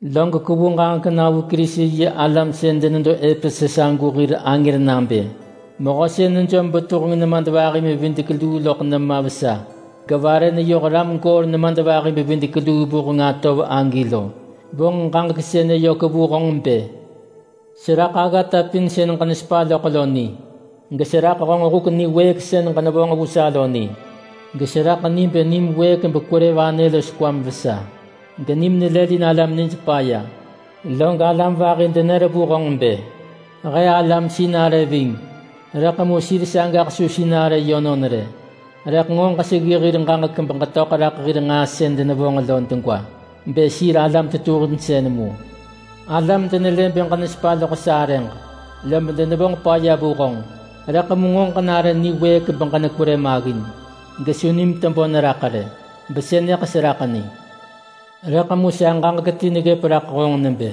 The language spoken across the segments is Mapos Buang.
“Log kwevu ġaġek na vu Kerisi-yi-alam sën denedo Epesus agu hir angër nabë: Mehö sën nejom betuheng nemadvahi-bevidek-luu loḳ nema vesa, gevare neyoh ram goor nemadvahi-bevidek-luu vuheng atov agi lo, vonġ ġaġek sënë yök vu honġ bë: Seraḳ aggata pin sën ġenesepa loḳ lo ni. Geseraḳ honġ huk niwëëk sën ġenevonġ vu sa lo ni. Geseraḳ ni bë nim wëëk bekwerë vanë los kwam vesa, genim nelëlin alam nij paya. Log alam vahi denër vu honġ bë, ‘He alam sinarë ving’, rëḳ mu sir sagaḳ su sinarë yönon rë. Rëḳ nġo ġeseggi hir ġaġek beġetöḳ raḳ hir nġaa sën denevonġ lo degwa bë sir alam tetuhinsën mu. Alam denelë bë ġenesepa loḳ sa arëġ, lob denevonġ paya vu honġ. Rëḳ mu nġo ġenare niwëëk beġenekwerë maggin gesu nim tebö neraḳ rë. Besënëḳ seraḳ ni. Rëḳ mu sa ġaġek ti neggëp raḳ honġ nebë: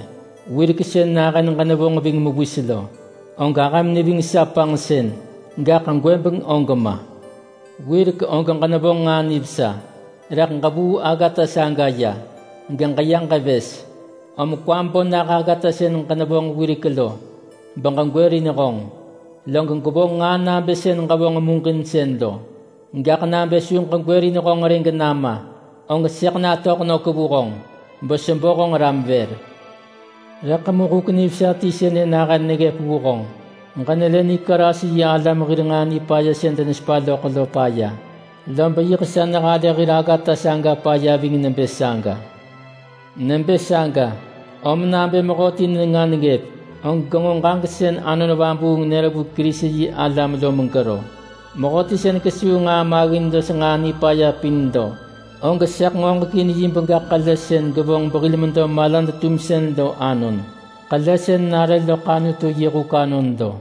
Wirek sën nahën ġenevonġ ving mewis lo, og ahëm neving sa panġsën, gaḳ gwëbeng og ma! Wirek og ġenevonġ nġaa nivesa, rëḳ ġevuu aggata saga ya geġeya ġevës. Om kwam bo nah aggata sën ġenevonġ wirek lo beġegwërin honġ, log gwevonġ nġaa nabë sën ġevonġ muġinsën lo. Gaḳ nabë su ġegwërin honġ rë genama, og sëḳ natöḳ nök vu honġ besebo honġ ram vër. Rëḳ mu huk nivesa ti sënë nahën neggëp vu honġ: Ġenelë Nikolas yi alam hir nġaa nipaya sën denesepa loḳ lo paya. Lob yiḳ sa nehalë hir aggata saga paya ving nebë saga. Nebë saga, om nabë mehöti nenga neggëp, og genġo ġaġek sën Anon Vabuung nër vu Kerisi-yi-alam lo megero! Mehöti sën kesuu nġaa maggin los nġaa nipaya pin lo, og sëḳ ngoġekin yi bega ḳele sën gevonġ behil medo malad-tumsën lo anon. Ḳele sën nare loḳ Anutu yi huk anon lo.”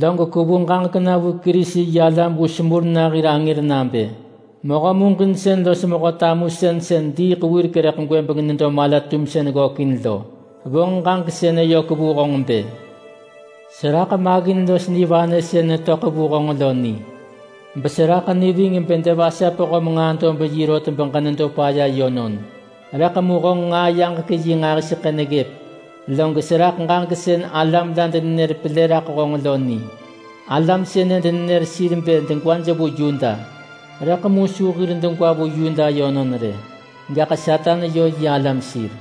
“Log kwevu ġaġek na vu Kerisi-yi-alam vu Smurna hir angër nabë: Mehö muġinsën los mehö tamusën sën diiḳ wirek rëḳ gwëbeng nedo mala-tumsën ggökin lo vonġ ġaġek sënë yök vu honġ bë: Seraḳ maggin los nivanë sën netöḳ vu honġ lo ni, beseraḳ ni ving bë devasap höm nġaa-dob-yi rot geġenedo paya yönon. Rëḳ mu honġ nġaa-yaġek-yi nġahiseḳë neggëp! Log seraḳ ġaġek sën alam la denenër pelë raḳ honġ lo ni. Alam sënë denenër sir bë sir degwa vu Yuda. Rëḳ mu su degwaj vu Yuda yönon rë, gaḳ Satan yö yi alam sir.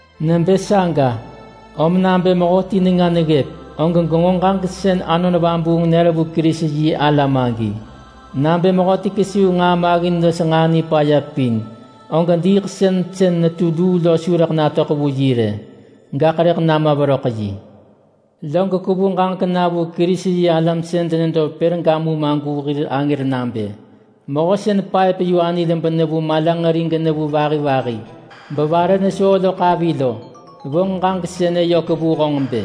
Nebë saga, om nabë mehöti nenga neggëp, og genġo ġaġek sën Anon Vabuung nër vu Kerisi-yi-alam agi! Nabë mehöti kesuu nġaa maggin los nġaa nipaya pin, og diiḳsën sën netu luu lo su rëḳ natöḳ vu yi rë, gaḳ rëḳ nama veröḳ yi!” “Log kwevu ġaġek na vu Kerisi-yi-alam sën denedo Pergamum agu hir angër nabë: Mehö sën paëp-yu-anil benevu malanġeri genevu vahi vahi bevare nesoo loḳ avi lo, vonġ ġaġek sënë yök vu honġ bë: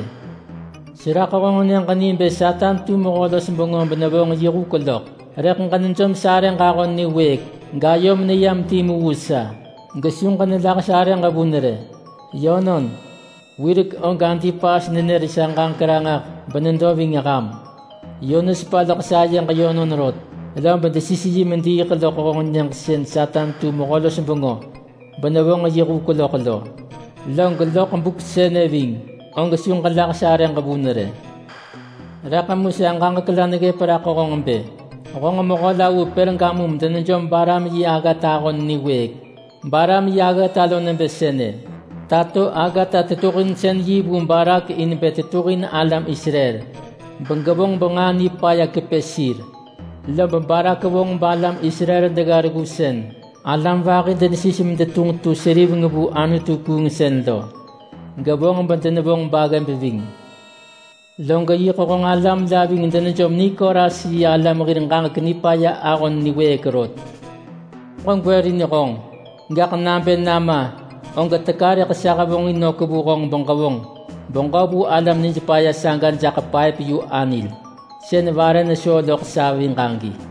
Seraḳ honġ nyëġ ni bë Satan tu mehö-los-bengö benevonġ yi huk loḳ. Rëḳ ġenejom sarëġ ahon niwëëk gayom neyam timu vu sa, gesu ġenelah sarëġ vun rë. Yönon, wirek og Antipas nenër sa ġaġek ranġah benedo ving ham. Yö nesepa loḳ sayeġ yönon rot. Lob desis yi mediiḳ loḳ honġ nyëġ sën Satan tu mehö-los-bengö benevonġ yi huk loḳ lo. Log loḳ buk sënë ving, og su ġelah sarëġ vun rë. Rëḳ mu sa ġaġek la neggëp raḳ honġ bë: Honġ mehö la vu Pergamum denejom Balaam yi aggata ahon niwëëk. Balaam yi aggata lo nebë sënë: Tato aggata-tetuhinsën-yi vu Balak in bë tetuhin alam Israel begevonġ benġaa nipaya kepë sir. Lob Balak vonġ balam Israel degga reggu sën alam vahi denesis medetunġ tu seriveng vu anutu-kuungsën lo, gevonġ bedenevonġ baggëb ving. Log yiḳ honġ alam la ving denejom Nikolas yi alam hir ġaġek nipaya ahon niwëëk rot. Om ġegwërin honġ. Gaḳ nabë nama, og teka rëḳ sa hevonġin nök vu honġ beġevonġ beġö vu alam nijpaya saga jaḳ paëp-yu-anil sën vare nesoo loḳ saviġ agi.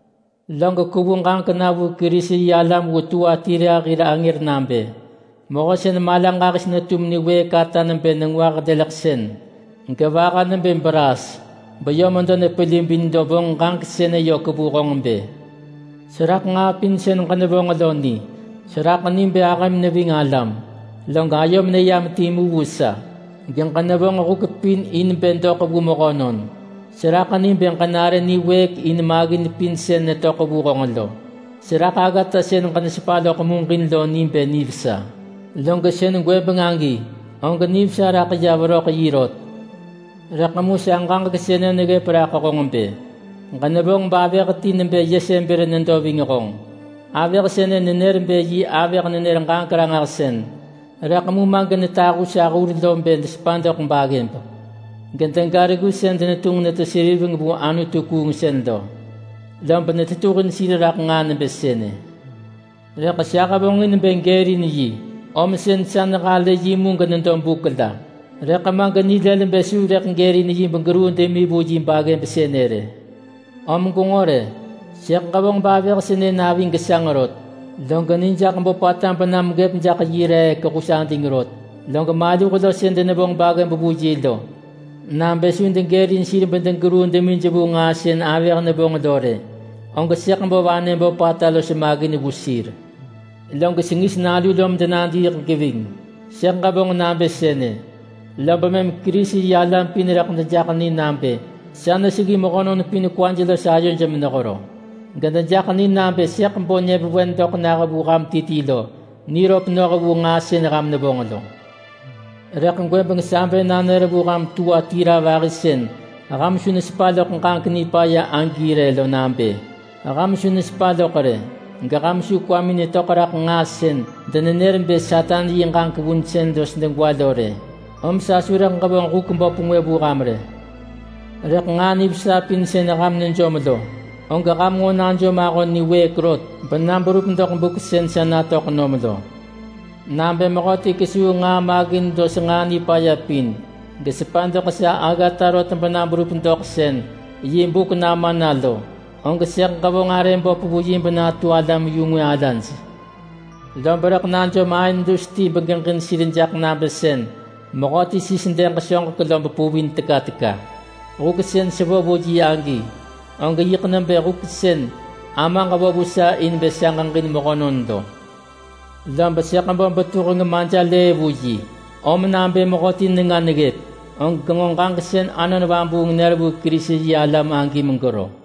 “Log kwevu ġaġek na vu Kerisi-yi-alam vu Tuatira hir angër nabë: Mehö sën mala ġahis netum niwëëk ata nebë nengwah leleḳsën, gevaha nebë braas beyö medo nepelibin lo vonġ ġaġek sënë yök vu honġ bë: Seraḳ nġaa pin sën ġenevonġ lo ni. Seraḳ ni bë ahëm neving alam, log ayom neyam timu vu sa, geġenevonġ huk pin in bë doḳ vu mehönon. Seraḳ ni bë ġenare niwëëk in maggin pin sën netöḳ vu honġ lo. Seraḳ aggata sën ġenesepa loḳ muġin lo ni bë nivesa. Log sën gwëbeng agi, og nivesa raḳ ya veröḳ yi rot. Rëḳ mu sa ġaġek sënë neggëp raḳ honġ bë: Ġenevonġ bavëh ti nebë Yesebel nedo ving honġ. Avëh sënë nenër bë yi avëh-nenër-ġaġek-ranġahsën, rëḳ mu ma genetahu sa hur lo bë desepa doḳ baggëb, gedega reggu sën denetunġ netu seriveng vu anutu-kuungsën lo. Lob netetuhin sir raḳ nġaa nebë sënë. Rëḳ sa hevonġin bë gërin yi, om sën sa nehalë yi mu genedo buk la, rëḳ ma genilël bë su gërin yi begeruu demi vu yi baggëb sënë rë. Om gwenġo rë! Sëḳ ġevonġ bavëh sënë navi gesanġ rot, log ni jaḳ böpata bena megëp jaḳ yi reek hus ading rot. Log maluh lo sën denevonġ baggëb vu yi lo, nabë su degërin sir bedegeruu demij vu nġaa sën avëh nevonġ lo rë, og sëḳ bo vanë böpata los maggin vu sir. Log sengis nalu lo medenadiiḳ geving. Sëḳ ġevonġ nabë sënë, lob mëm Kerisi-yi-alam pin rëḳ dejaḳ ni nabë sa neseggi mehönon pin kwaj los ayoj menehero. Gedejaḳ ni nabë sëḳ bo nyëvewen doḳ nah vu ham ti ti lo niröp noh vu nġaa sën ham nevonġ lo. Rëḳ gwëbeng sa bë nanër vu ham Tuatira vahi sën ham su nesepa loḳ ġaġek nipaya agi rë lo nabë: Ham su nesepa loḳ rë geham su kwamin netöḳ raḳ nġaa sën denenër bë Satan yi ġaġek vunsën los degwa lo rë, om sa su rëḳ ġevonġ huk böp ngwë vu ham rë. Rëḳ nġaa nivesa pin sën ham nejom lo, og ham nġo najom ahon niwëëk rot bena berup doḳ buk sën sa natöḳ nom lo. Nabë mehöti kesuu nġaa maggin los nġaa nipaya pin, gesepa doḳ sa aggata rot bena berup doḳ sën yi buk nama na lo, og sëḳ ġevonġ arë böp vu yi benatu alam-yu-ngwë alaj— ‘Lob rëḳ najom aën dus ti begeġin sir jak nabë sën mehöti sis dëg soġek lob puvin teka teka.’ Huk sën sevo vu yi agi, og yiḳ nebë huk sën Amaġ vo vu sa in bë sa ġeġin mehönon lo. Lob sëḳ bo betuheng Majelëë vu yi, om nabë mehöti nenga neggëp, og genġo ġaġek sën Anon Vabuung nër vu Kerisi-yi-alam agi megero!”